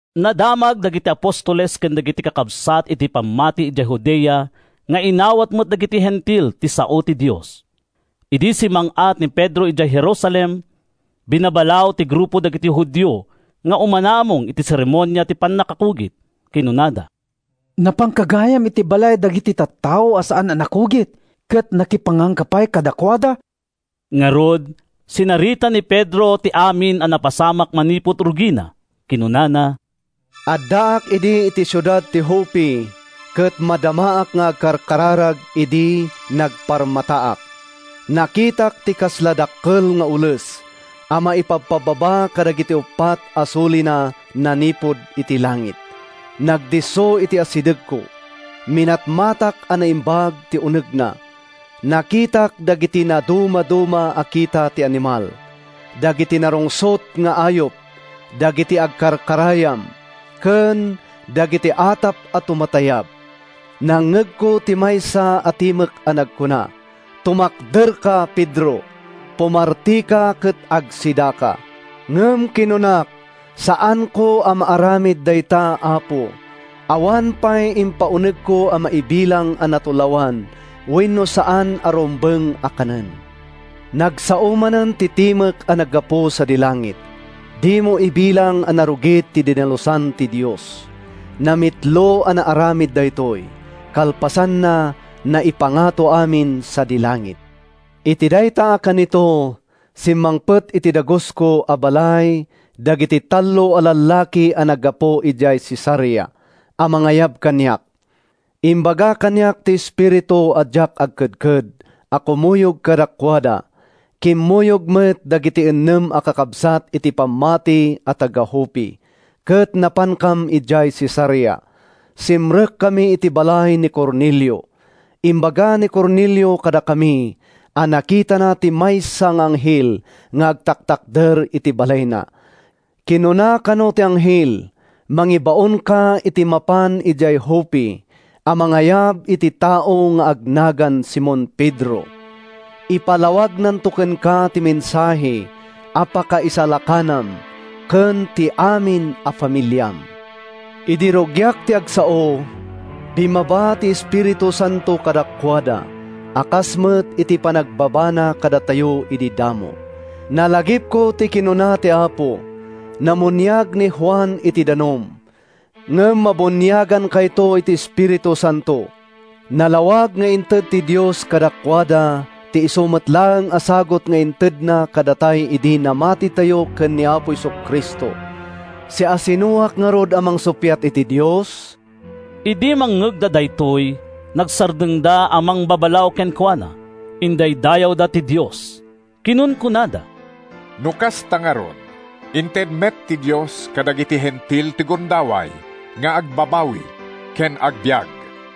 Nadamag dagiti apostoles ken dagiti kakabsat iti pammati idiay Judea nga inawat met dagiti Hentil ti sao ti Dios. Idi simmang-at ni Pedro idiay Jerusalem, binabalaw ti grupo dagiti Judio nga umanamong iti seremonia ti pannakakugit. Kinunada, “Napanka gayam iti balay dagiti tattao a saan a nakugit ket nakipanganka pay kadakuada!” Ngarud, sinarita ni Pedro ti amin a napasamak manipud rugina. Kinunana: “Addaak idi iti siudad ti Joppe ket madamaak nga agkarkararag idi nagparmataak. Nakitak ti kasla dakkel nga ules a maipabpababa kadagiti uppat a sulina manipud iti langit. Nagdisso iti asidegko. Minatmatak a naimbag ti unegna. Nakitak dagiti nadumaduma a kita ti animal, dagiti narungsot nga ayup, dagiti agkarkarayam ken dagiti atap a tumatayab. Nangngegko ti maysa a timek a nagkuna, ‘Tumakderka, Pedro. Pumartika ket agsidaka.’ “Ngem kinunak, ‘Saanko a maaramid dayta, Apo! Awan pay impaunegko a maibilang a natulawan wenno saan a rumbeng a kanen.’ “Nagsao manen ti timek a naggapu sadi langit, ‘Dimo ibilang a narugit ti dinalusan ti Dios.’ Namitlo a naaramid daytoy. Kalpasanna, naipangato amin sadi langit. “Iti dayta a kanito, simmangpet iti dagusko a balay dagiti tallo a lallaki a naggapu idiay Cesarea a mangayab kaniak. Imbaga kaniak ti Espiritu a diak agkedked a kumuyog kadakuada. Kimmuyog met dagiti innem a kakabsat iti pammati a taga-Joppe ket napankam idiay Cesarea. Simrekkami iti balay ni Cornelio. “Imbaga ni Cornelio kadakami a nakitana ti maysa nga anghel nga agtaktakder iti balayna. Kinuna kano ti anghel, ‘Mangibaonka iti mapan idiay Joppe a mangayab iti tao nga agnagan Simon Pedro. Ipalawagnanto kenka ti mensahe a pakaisalakanam ken ti amin a familiam.’ “Idi rugiak ti agsao, bimmaba ti Espiritu Santo kadakuada a kas met iti panagbabana kadatayo idi damo. Nalagipko ti kinuna ti Apo, ‘Namuniag ni Juan iti danum, ngem mabuniagankayto iti Espiritu Santo.’ “Nalawag nga inted ti Dios kadakuada ti isu met laeng a sagut nga intedna kadatay idi namatitayo ken ni Apo Jesu-Cristo. Siasinoak ngarud a mangsuppiat iti Dios?” Idi mangngegda daytoy, nagsardengda a mangbabalaw kenkuana. Indaydayawda ti Dios. Kinunkunada, “No kasta ngarud, inted met ti Dios kadagiti Hentil ti gundaway nga agbabawi ken agbiag!”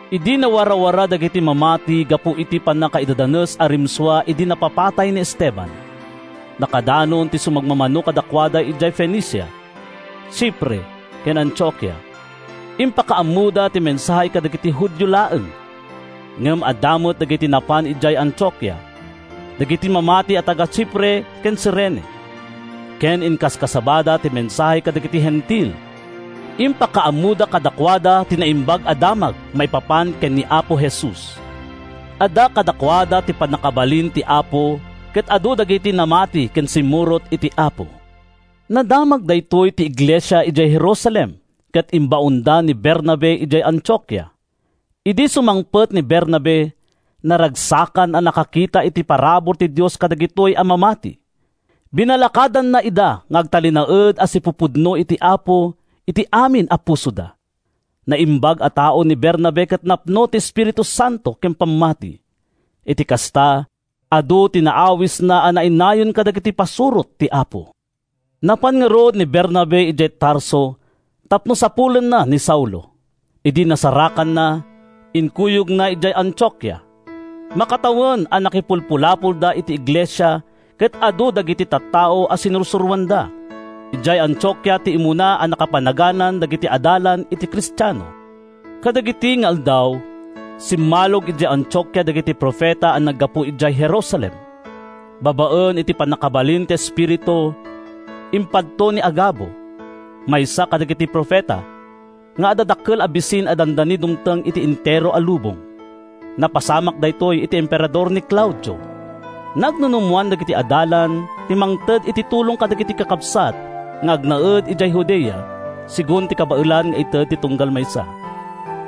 Idi nawarawara dagiti mamati gapu iti pannakaidadanes a rimsua idi napapatay ni Esteban, nakadanon ti sumagmamano kadakuada idiay Fenicia, Chipre ken Antiokia. Impakaammoda ti mensahe kadagiti Judio laeng. Ngem adda met dagiti napan idiay Antiokia, dagiti mamati a taga-Chipre ken Cirene, ket inkaskasabada ti mensahe kadagiti Hentil. Impakaammoda kadakuada ti Naimbag a Damag maipapan ken ni Apo Jesus. Adda kadakuada ti pannakabalin ti Apo ket adu dagiti namati ken simmurot iti Apo. Nadamag daytoy ti iglesia idiay Jerusalem ket imbaonda ni Bernabe idiay Antiokia. Idi sumangpet ni Bernabe, naragsakan a nakakita iti parabur ti Dios kadagitoy a mamati. Binalakadanna ida nga agtalinaed a sipupudno iti Apo iti amin a pusoda. Naimbag a tao ni Bernabe ket napno iti Espiritu Santo ken pammati. Iti kasta, adu ti naawisna a nainayon kadagiti pasurot ti Apo. Napan ngarud ni Bernabe idiay Tarso tapno sapulenna ni Saulo. Idi nasarakanna, inkuyogna idiay Antiokia. Makatawen a nakipulpulapolda iti iglesia ket adu dagiti tattao a sinursuroanda. Idiay Antiokia ti immuna a nakapanaganan dagiti adalan iti Kristiano. Kadagidi nga aldaw, simmalog idiay Antiokia dagiti profeta a naggapu idiay Jerusalem. Babaen iti pannakabalin ti Espiritu, impadto ni Agabo, maysa kadagiti profeta, nga adda dakkel a bisin a dandani dumteng iti entero a lubong. (Napasamak daytoy idi emperador ni Claudio.) Nagnunumoan dagiti adalan ti mangted iti tulong kadagiti kakabsat nga agnaed idiay Judea segun ti kabaelan nga ited ti tunggal maysa.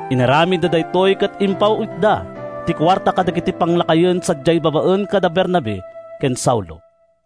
Inaramidda daytoy ket impaw-itda ti kuarta kadagiti panglakayen sadiay babaen kada Bernabe ken Saulo.